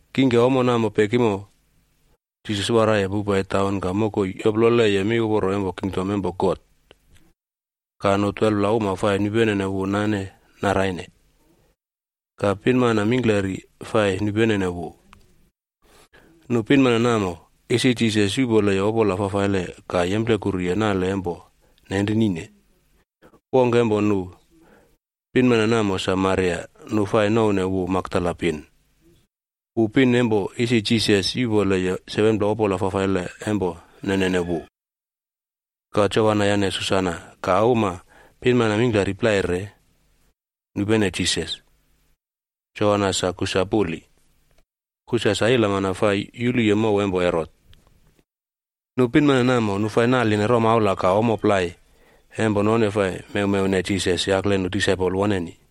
Kingke ommo namo pekimo, Jisas waraiye powpai taun ka mokoi yoploleye miuporo empo kingdom empo God, ka nu 12pla uma fai nupenene wu nane naraine. Ka pinmana plai fai nupene wu. Nu pinmana namo, isi Jisas yuꞌpoleye opola fafaile ka yemplekuruye nale empo nenrinine. Wongke empo nu pinmana namo sa Maria nu fai nouwne wu Makdala pin. Wu pin empo isi Jisas yuꞌpoleye 7pla opola fafaile empo nenene wu. Ka Joana yane Susana ka uma pinmana mingklari plai re, nupene Jisas. Joana sa Kusa puli, Kusa sa ilamana fai yuluye mow empo Herot. Nu pinmana namo nu fai naline romaula ka ommo plai empo none fai mewmewne Jisas yakle nu disaipol woneni.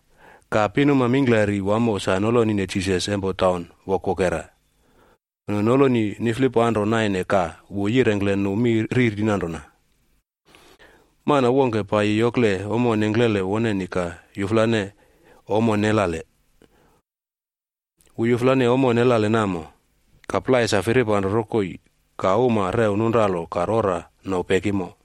Ka pinuma mingklari wamo sa nolonine Jisas empo taun wokwokera. Nu noloni niflipanro naine ka wu yirengkle nu mi riri nanrona, “Mana wongke paiyi yokle ommo nengklele woneni ka yuflane ommo nelale. Wu yuflane ommo nelale namo, ka plai sa firipanro rokoi ka uma rew nunralo ka rora no pekimo.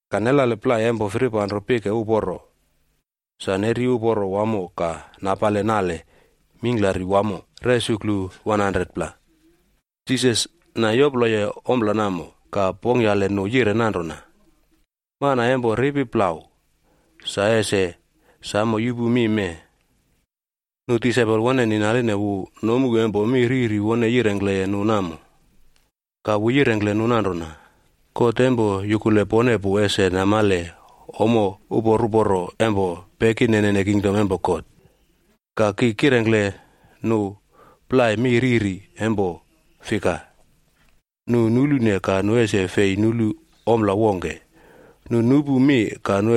Ka nelale plai empo firipanro pike uporo, sa neri uporo wamo ka napale nale mingklari wamo resuklu 100pla.” Jisas na yoploye ompla namo, ka pongkyale nu yire nanrona, “Mana empo ripi plau, sa ese samo yupu mi mee.” Nu disaipol woneni naline wu nomu empo mi riri wone yirengkleye nu namo. Ka wu yirengkle nu nanrona, “God empo yukule pone pu ese namale ommo upor uporo empo pekinene kingdom empo God. Ka, ki kirengkle nu plai mi riri,a empo fika, ‘Nu nulune, ka nu ese fei nulu ompla wongke. Nu nupu mi,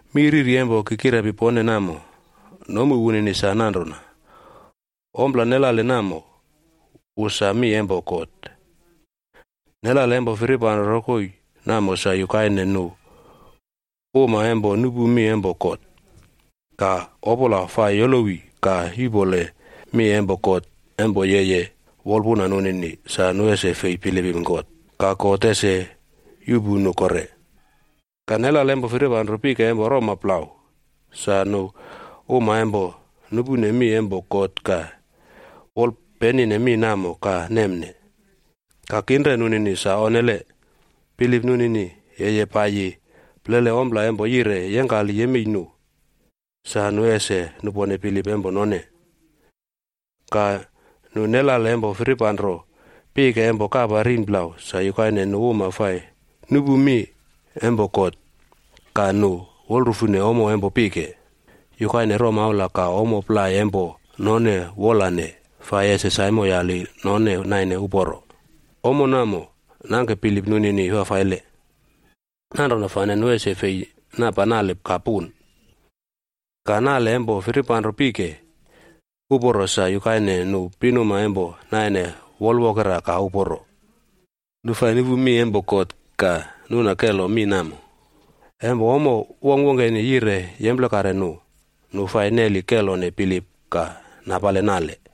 “Mi riri empo ki kirepi pone namo, nomu wunini sa nanrona: Ompla nelale namo, wu sa mi empo God. Nelale empo firipanro rokoi namo sa yukaine nu uma empo nupu mi empo God, ka Opola fai yolowi ka yuꞌpole mi empo God empo yeye wolpuna nunini sa nu ese fei bilipim God, ka God ese yuꞌpu nu kore. Ka nelale empo firipanro pike empo roma plau, sa nu uma empo nupune mi empo God ka wolpenine mi namo ka nemne. Ka kinre nunini sa onnele, bilip nunini yeye paiyi plele ompla empo yire yengkali yemei nu, sa nu fai nupone bilip empo none. Ka nelale empo firipanro pike empo kapa rin plau sa yukaine nu uma fai nupu mi empo God, ka nu wolrufune ommo empo pike, yukaine romaula ka ommo plai empo none wolane fai ese saimoyali none naine uporo, ommo namo nangke bilip nunini fafaile. Nanrona fane nu ese fei napa nale ka puno. Ka, nelale empo firipanro pike uporo sa yukaine nu pinuma empo naine wol wokera ka uporo. Nu fai nupu mi empo God ka nuna kelo mi namo. Empo ommo wongkwongkeni yire yemplekare nu, nu fai neli kelone bilip ka napale nale.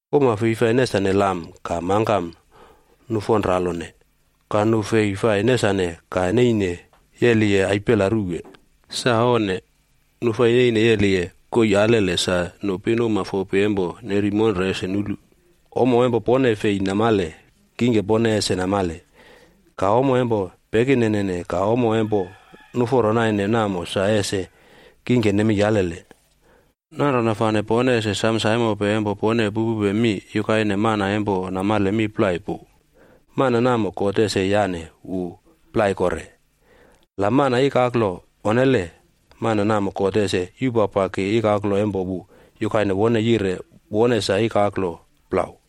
“Uma fei fai nesane lam ka mangkam nufonralone, ka nu fei fai nesane ka ninapowe yeliye aipela ruwe. Sa onne! Nu fai neine yeliye koii alele sa nu pinuma fopi empo neri monre ese nulu. Ommo empo pone fei namale kingke pone ese namale, ka ommo empo pekinene ka ommo empo nuforo naine namo sa ese kingke nemei alele. Nanrona fane pone ese sam saimope empo pone pupupe mi, yukaine mana empo namale mi plai pu, mana namo God ese yane wu plai kore. La mana ikaklo onne, mana namo God ese yupapaki ikaklo wunini yukaine wu yire wone sa ikaklo plau.”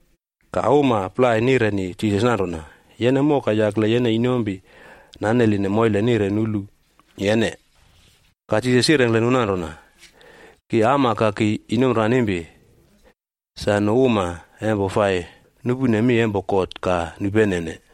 Ka uma plai nireni Jisas nanrona, “Yene moka yakle yene inompi naneline moile nire nulu yene.” Ka Jisas yirengkle nu nanrona, “Ki ama ka ki inompiranimpi, sa nu uma empo fai nupune mi empo God ka nupenene.”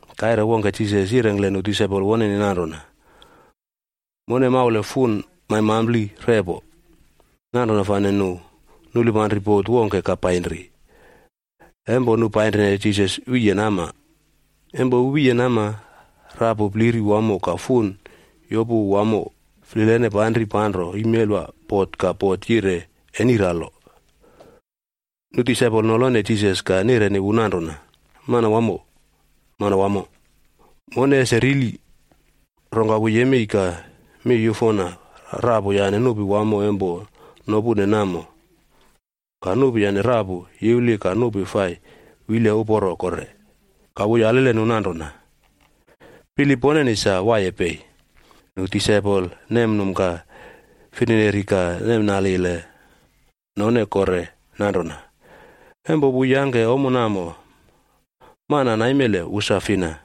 Kaire wongke Jisas yirengkle nu disaipol woneni nanrona, “Mone maule fun maimampli repo.” Nanrona fane nu nulipanri bot wongke ka painri. Empo nu painrine Jisas wiye nama. Empo wu wiye nama, rapu pliri wamo ka fun yopu wamo flilene panri panro imelwa bot ka bot yire eniralo. Nu disaipol nolone Jisas ka nireni wu nanrona, “Manwamo, Manwamo, mone ese rili!” Rongka wu yemei ka miyufona rapu yane nupi wamo empo nopune namo. Ka nupi yane rapu yiwli ka nupi fai wile uporo kore. Ka wu yalile nu nanrona, “Bilip poneni sa waiye pei?” Nu disaipol nemnum ka firineri ka nemnalile none kore nanrona, “Empo wu yangke ommo namo, mana naimele wu sa fina?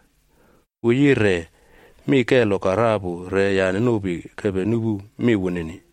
Wu yire mi kelo ka rapu re yane nupi kepe nupu mi wunini.”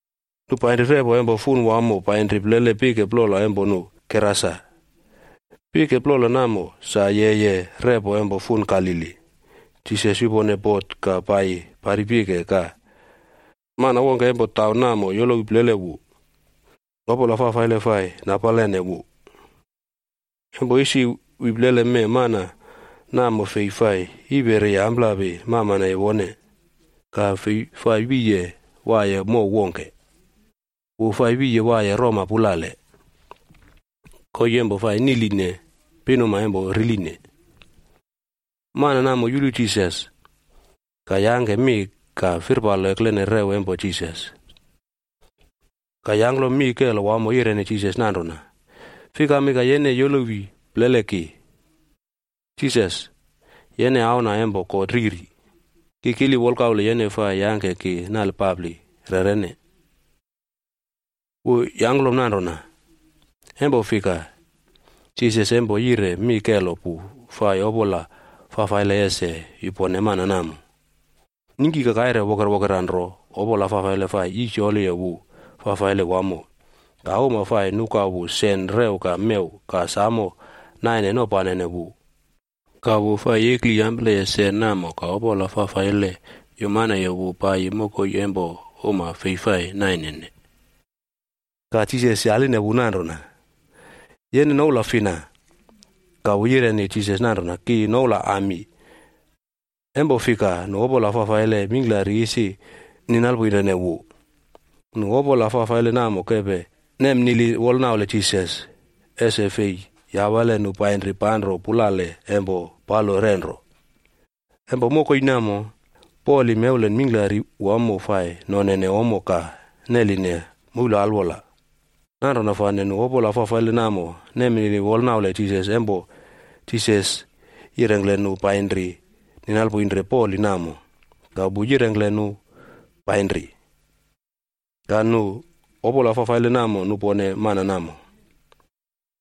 Nu painri repo empo fun wamo painri plele pike plola empo nu Gerasa. Pike plola namo sa yeye repo empo fun Galili. Jisas yupone bot ka paiyi pari pike, ka mana wongke empo taun namo yolowi plele wu. Opola fafaile fai nisinoline wu. Empo isi wi plele mee mana namo fei fai yiperiye amplapi mamaneye wone. Ka fei fai wiye waiye mow wongke. Wu fai wiye waiye roma pulale, koii empo fai niꞌline pinuma empo riline. Mana namo yulu Jisas, ka yangke mi ka firpalo eklene rew empo Jisas. Ka yangklom mi kelo wamo yireni Jisas nanrona, “Fikami ka yene yolowi plele ki, Jisas, yene Auna empo God Riri! Ki kili wolkaule yene fai yake ki eni ka yangke ki nalpapli rerene.” Wu yangklom nanrona, empo fika, Jisas empo yire mi kelo pu fai opola fafaile ese yupone mana namo. Ningki ka kaire wokerwokera nro opola fafaile fai yisyoli wu fafaile wamo, ka uma fai nuka wu sen rew ka mew ka samo naine nopanene wu. Ka wu fai yekliyampleye sen namo ka opola fafaile yumaneye wu paiyi mokoi empo uma fei fai nainene. Ka Jisas yaline wu nanrona, “Yene noula fina?” Ka wu yireni Jisas nanrona, “Ki noula Ami.” Empo fika nu opola fafaile mingklari isi ninalpoinrene wu. Nu opola fafaile namo kepe nemnili wolnaule Jisas, ese fei yawale nu painri panro pulale empo palo renro. Empo mokoi namo, poli mewlen mingklari wamo fai nonene ommo ka neline moul alwola. Nanrona fane nu opola fafaile namo nemnili wolnaule Jisas empo Jisas yirengkle nu painri ninalpoinre poli namo, ka wu yirengkle nu painri. Ka nu opola fafaile namo nupone mana namo,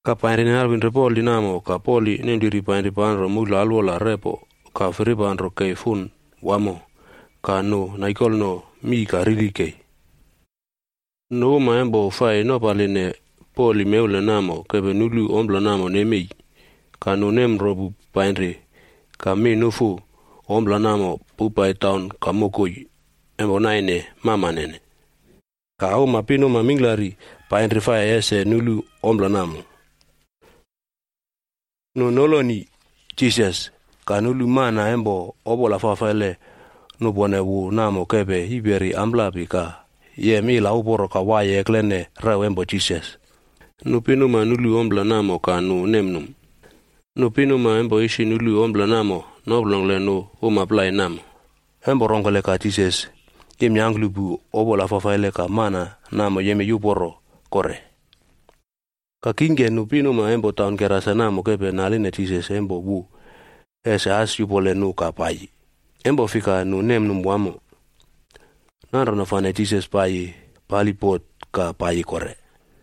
ka painri ninalpoinre poli namo ka poli nempliri painri panro moul alwola repo ka firipanro kei fun wamo, ka nu naikolno mii ka rili kei. Nu uma empo fai nopaline poli mewlen namo kepe nulu ompla namo nemei, ka nu nemropu painri ka mi nufu ompla namo powpai taun ka mokoi empo naine mamanene. Ka uma pinuma mingklari painri fai ese nulu ompla namo. Nu noloni Jisas, ka nulu mana empo opola fafaile nupone wu namo kepe yiperi amplapi ka yem ila uporo ka waiye eklene rew empo Jisas. Nu pinuma nulu ompla namo ka nu num. Nu pinuma empo isi nulu ompla namo noplongkle nu uma plai namo, empo rongkele ka Jisas yemyangklupu opola fafaile ka mana namo yemei uporo kore. Ka kingke nu pinuma empo taun Gerasa namo kepe naline Jisas empo wu ese as yupole nu ka paiyi, empo fika nu nemnum wamo. Nanrona fane Jisas paiyi pali bot ka paiyi kore.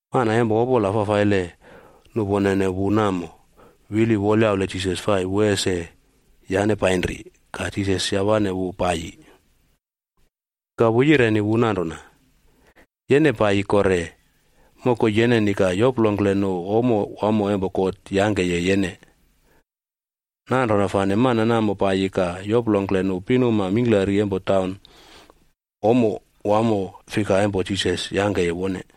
Mana empo opola fafaile nuponene wu namo wili wolyaule Jisas fai wu ese yane painri, ka Jisas yawane wu paiyi. Ka wu yireni wu nanrona, “Yene paiyi kore mokoi yeneni ka yoplongkle nu ommo wamo empo God yangkeye yene.” Nanrona fane mana namo paiyi ka yoplongkle nu pinuma mingklari empo taun ommo fika wamo empo Jisas yangkeye wone.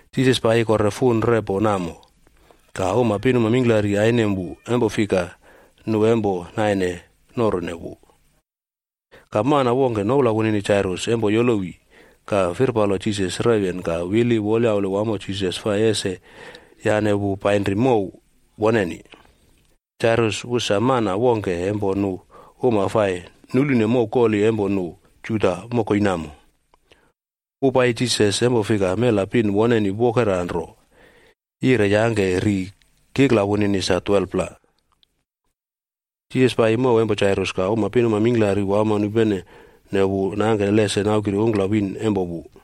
Jisas paiyi kore fun repo namo, ka uma pinuma mingklari ainem wu, empo fika nu empo naine norune wu. Ka mana wongke noula wunini Jairus empo yolowi ka firpalo Jisas rewyen ka wili wolyaule wamo Jisas fai ese yane wu painri mow woneni. Jairus wu sa mana wongke empo nu uma fai nulune mow koli empo nu Juda mokoi namo. Wu paiyi Jisas empo fika mela pin woneni wokera nro, yire yangke ri kikla wunini sa 12pla. Jisas paiyi mow empo Jairus, ka uma pinuma mingklari wamo nupene wu nangke lese naukiri ungklawiin empo wu.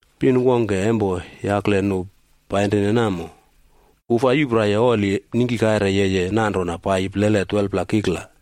Pin wongke empo yakle nu painrine namo. Wu fai yupraiye oli ningki kaire yeye nanrona paiyi plele 12pla kikla,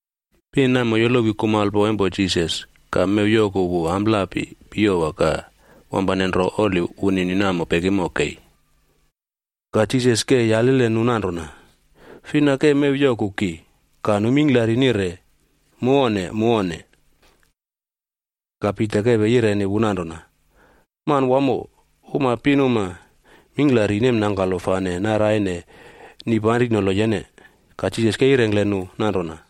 Pin namo yolowi kumalpo empo Jisas ka mew yoku wu amplapi piyowa ka wampane nro oli wunini namo pekimo kei. Ka Jisas ke yalile nu nanrona, “Fina ke mew yoku ki?” Ka nu mingklari nire, “Mu onne. Mu onne.” Ka Pita kepe yireni wu nanrona, “Manwamo, uma pinuma mingklari nemnangkalo fane naraine nipanrinolo yene.” Ka Jisas ke yirengkle nu nanrona,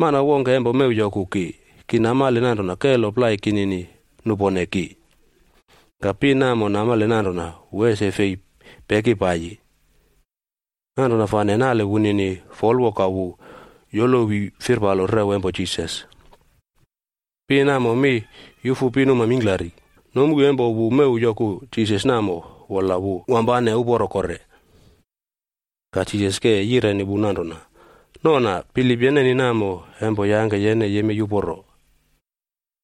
“Mana wongke empo mew yoku ki, ki namale nanrona kelo plai kinini nupone ki.” Ka pin namo namale nanrona wu ese fei peki paiyi, nanrona fane nale wunini folwo ka wu yolowi firpalo rew empo Jisas. Pin namo mi yufu pinuma mingklari, nomu empo wu mew yoku Jisas namo wola wu wampane uporo kore. Ka Jisas ke yireni wu nanrona, “Nona, bilip yeneni namo empo yangke yene yemei uporo.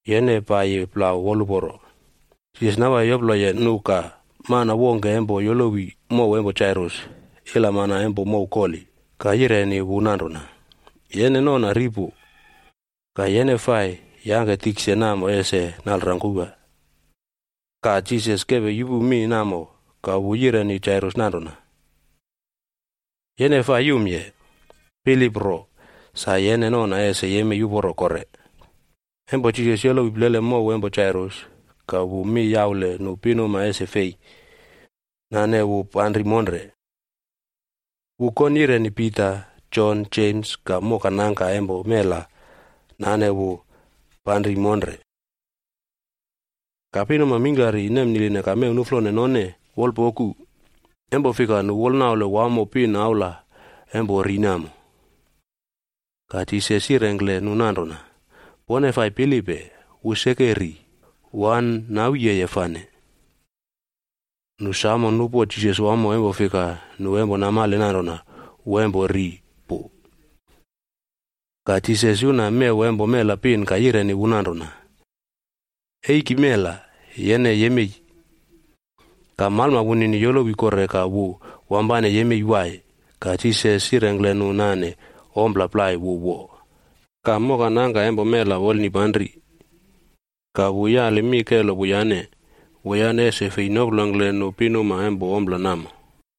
Yene paiyi plau woluporo.” Jisas nawaiye yoploleye nu ka mana wongke empo yolowi mow empo Jairus ilamana empo mow koli, ka yireni wu nanrona, “Yene nona ri pu, ka yene fai yangke tikse namo ese nalrangkowa.” Ka, Jisas kepe yupu mi namo ka wu yireni Jairus nanrona, “Yene fai yumye, bilip ro, sa yene nona ese yemei uporo kore.” Empo Jisas yolowi plele mow empo Jairus, ka wu mi yaule nu pinuma ese fei nane wu panri monre. Wu kon yireni Pita, Jon, Jems, ka mokanangka empo mela nane wu panri monre. Ka pinuma mingklari nemniline ka mew nuflone none wolpoku, empo fika nu wolnaule wamo pin aula empo ri namo. Ka Jisas yirengkle nu nanrona, “Pone fai pilipe, wu seke ri, wu an nawiyeye fane.” Nu samo nupo Jisas wamo empo fika nu empo namale nanrona wu empo ri pu. Ka Jisas yuna mew empo mela pin ka yireni wu nanrona, “Eiki mela, yene yemei!” Ka malma wunini yolowi kore ka wu wampane yemei wai. Ka Jisas yirengkle nu nane ompla plai wu wo. Ka mokanangka empo mela wolnipanri, ka wu yali mi kelo wuyane, wuyane ese fei noplongkle nu pinuma empo ompla namo.